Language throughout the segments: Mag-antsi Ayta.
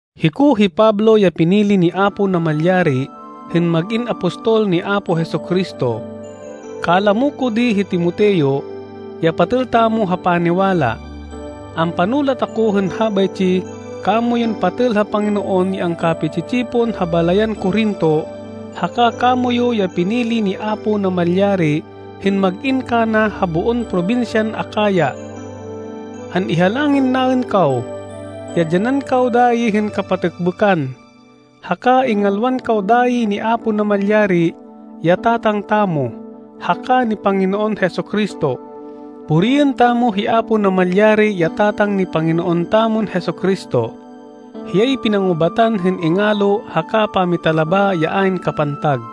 Hiko hi Pablo ya pinili ni Apo Namalyari hên mag-in apostol ni Apo Jesu-Cristo. Kalamo ko di hi Timoteo, ya patêl tamo ha paniwala. Ampanulat ako hên habaytsi kamoyun patêl ha Panginoon ya angkapi-tsi-tsipon ha balayan Corinto haka kamoyu ya pinili ni Apo Namalyari hên mag-in kana ha boon probinsyan Acaya. An-ihalangin naên kaw ya dyanan kaw dayi hên kapatêkbêkan, haka ingalwan kaw dayi ni Apo Namalyari ya Tatang tamo, haka ni Panginoon Jesu-Cristo. Puriên tamo hi Apo Namalyari, ya Tatang ni Panginoon tamon Jesu-Cristo. Hiyay pinangubatan hên ingalo haka pamitalaba ya ayn kapantag.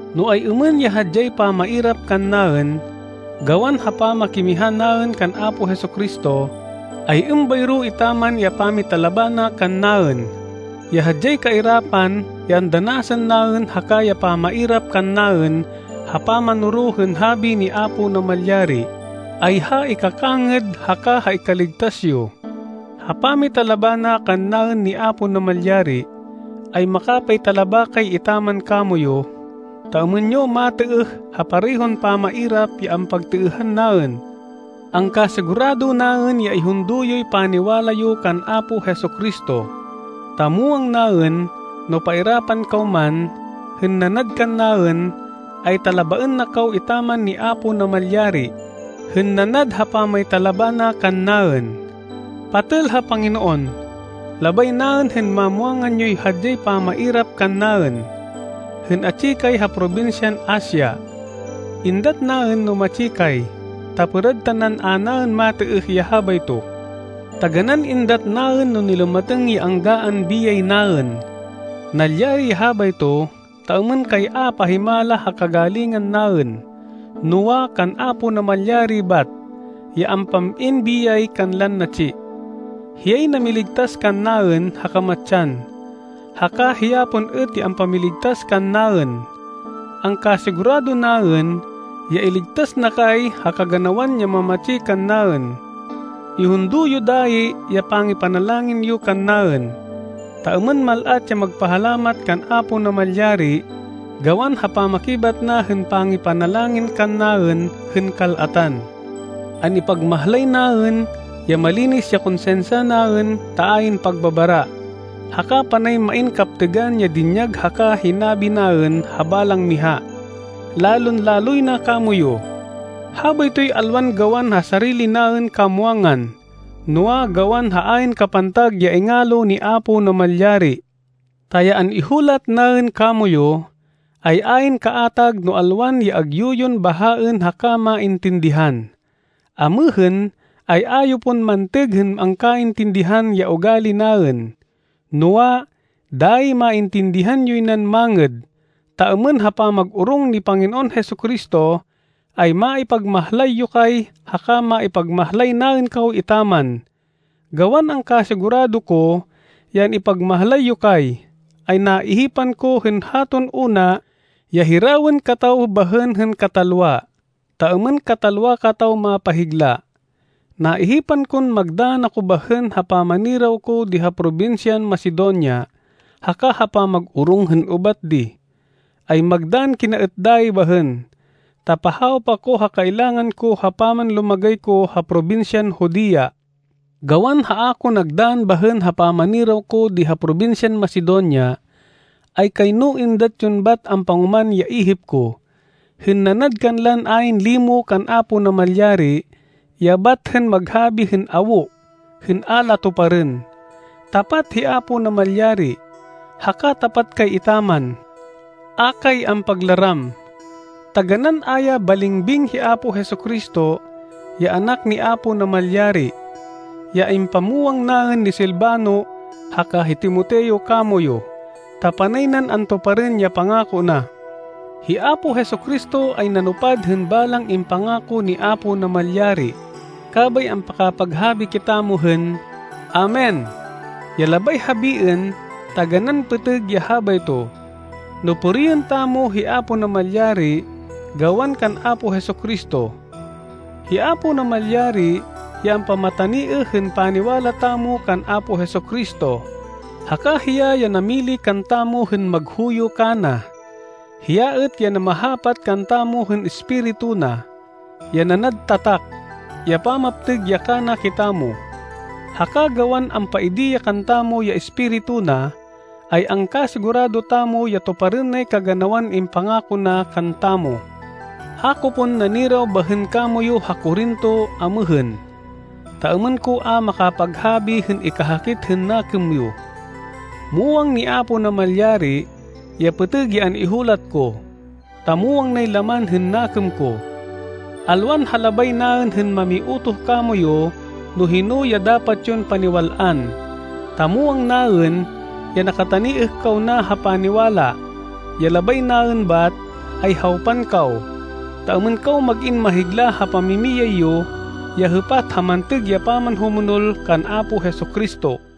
No ay-êmên ya hadyay pamairap kannaên, gawan ha pamakimiha naên kan Apo Jesu-Cristo, ay êmbayro etaman ya pamitalaba na kannaên. Ya hadyay kairapan ya andanasên naên haka ya pamairap kannaên ha pamanoro hên habi ni Apo Namalyari, ay ha ikakangêd haka ha ikaligtas yo. Ha pamitalaba na kannaên ni Apo Namalyari, ay makapaytalaba kay etaman kamoyu, ta êmên yo matêêh ha parehon pamairap ya ampagtêêhan naên. Angkasigurado naên ya ihundo yoy paniwala yo kan Apo Jesu-Cristo, ta muwang naên no pairapan kaw man, hên nanad kannaên, ay talabaên na kaw etaman ni Apo Namalyari, hên nanad ha pamaytalaba na kannaên. Patêl ha Panginoon, labay naên hên mamwangan yoy hadyay pamairap kannaên, hên atsi kay ha probinsyan Asia. Êndat naên no matsi kay, ta pêrad tanan a naên matêêh ya habayto. Taganán êndat naên no nilumatêng ya anggaan biyay naên. Nalyari ya habayto ta êmên kay a pahimala ha kagalingan naên, noa, kan Apo Namalyari bat, ya ampam-in biyay kanlan natsi. Hiyay namiligtas kannaên ha kamatsan, haka hiya pon êt ya ampamiligtas kannaên. Angkasigurado naên ya iligtas na kay ha kaganawan ya mamatsi kannaên. Ihundo yo dayi ya pangipanalangin yo kannaên, ta êmên mal-at ya magpahalamat kan Apo Namalyari gawan ha pamakibat na hên pangipanalangin kannaên hên kal-atan. An-ipagmahlay naên, ya malinis ya konsinsya naên ta ayn pagbabara, haka panay main kaptêgan ya dinyag haka hinabi naên ha balang miha, lalon-laloy na kamoyu. Habaytoy alwan gawan ha sarili naên kamwangan, noa, gawan ha ayn kapantag ya ingalo ni Apo Namalyari. Ta ya an-ihulat naên kamoyu, ay ayn kaatag no alwan ya agyu yon bahaên haka maintindihan. Amêhên ay a yo pon mantêg hên angkaintindihan ya ugali naên, noa, dayi maintindihan yoy nan mangêd, ta êmên ha pamag-orong ni Panginoon Jesu-Cristo, ay maipagmahlay yo kay haka maipagmahlay naên kaw etaman. Gawan angkasigurado ko ya an-ipagmahlay yo kay, ay naihipan ko hên haton una ya hirawên kataw bahên hên katalwa, ta êmên katalwa kataw mapahigla. Naihipan kon magdann ako bahên ha pamaniraw ko di ha probinsyan Macedonia, haka ha pamag-orong hên ubat di, ay magdann kina êt dayi bahên, ta pahawop ako ha kailangan ko ha pamanlumagay ko ha probinsyan Judea. Gawan ha a ko nagdann bahên ha pamaniraw ko di ha probinsyan Macedonia, ay kayno êndat yon bat ampangoman ya ihip ko, hên nanad kanlan ayn limo kan Apo Namalyari ya bat hên maghabi hên awo hên a la tuparên. Tapat hi Apo Namalyari, haka tapat kay etaman. A kay ampaglaram. Taganán a ya balingbing hi Apo Jesu-Cristo, ya anak ni Apo Namalyari, ya impamwang naên ni Silvano haka hi Timoteo kamoyu, ta panay nan antuparên ya pangako na. Hi Apo Jesu-Cristo ay nanupad hên balang impangako ni Apo Namalyari, kabay ampakapaghabi kitamo hên “Amen” ya labay habiên “taganán pêtêg ya habayto” no puriên tamo hi Apo Namalyari gawan kan Apo Jesu-Cristo! Hi Apo Namalyari ya ampamataniêh hên paniwala tamo kan Apo Jesu-Cristo, haka hiya ya namili kantamo hên maghuyo kana. Hiya êt ya namahapat kantamo hên Espiritu na, ya nanad tatak, ya pamaptêg ya kana kitamo. Haka gawan ampaidi ya kantamo ya Espiritu na, ay angkasigurado tamo ya tuparên nay kaganawan impangako na kantamo. A ko pon naniraw bahên kamoyu ha Corinto amêhên, ta êmên ko a makapaghabi hên ikahakit hên nakêm yo. Muwang ni Apo Namalyari ya pêtêg ya an-ihulat ko, ta muwang nay laman hên nakêm ko! Alwan ha labay naên hên mamiutoh kamoyu no hino ya dapat yon paniwal-an, ta muwang naên ya nakataniêh kaw na ha paniwala. Ya labay naên bat, ay hawpan kaw, ta êmên kaw mag-in mahigla ha pamimiyay yo ya hêpat ha mantêg ya pamanhumonol kan Apo Jesu-Cristo.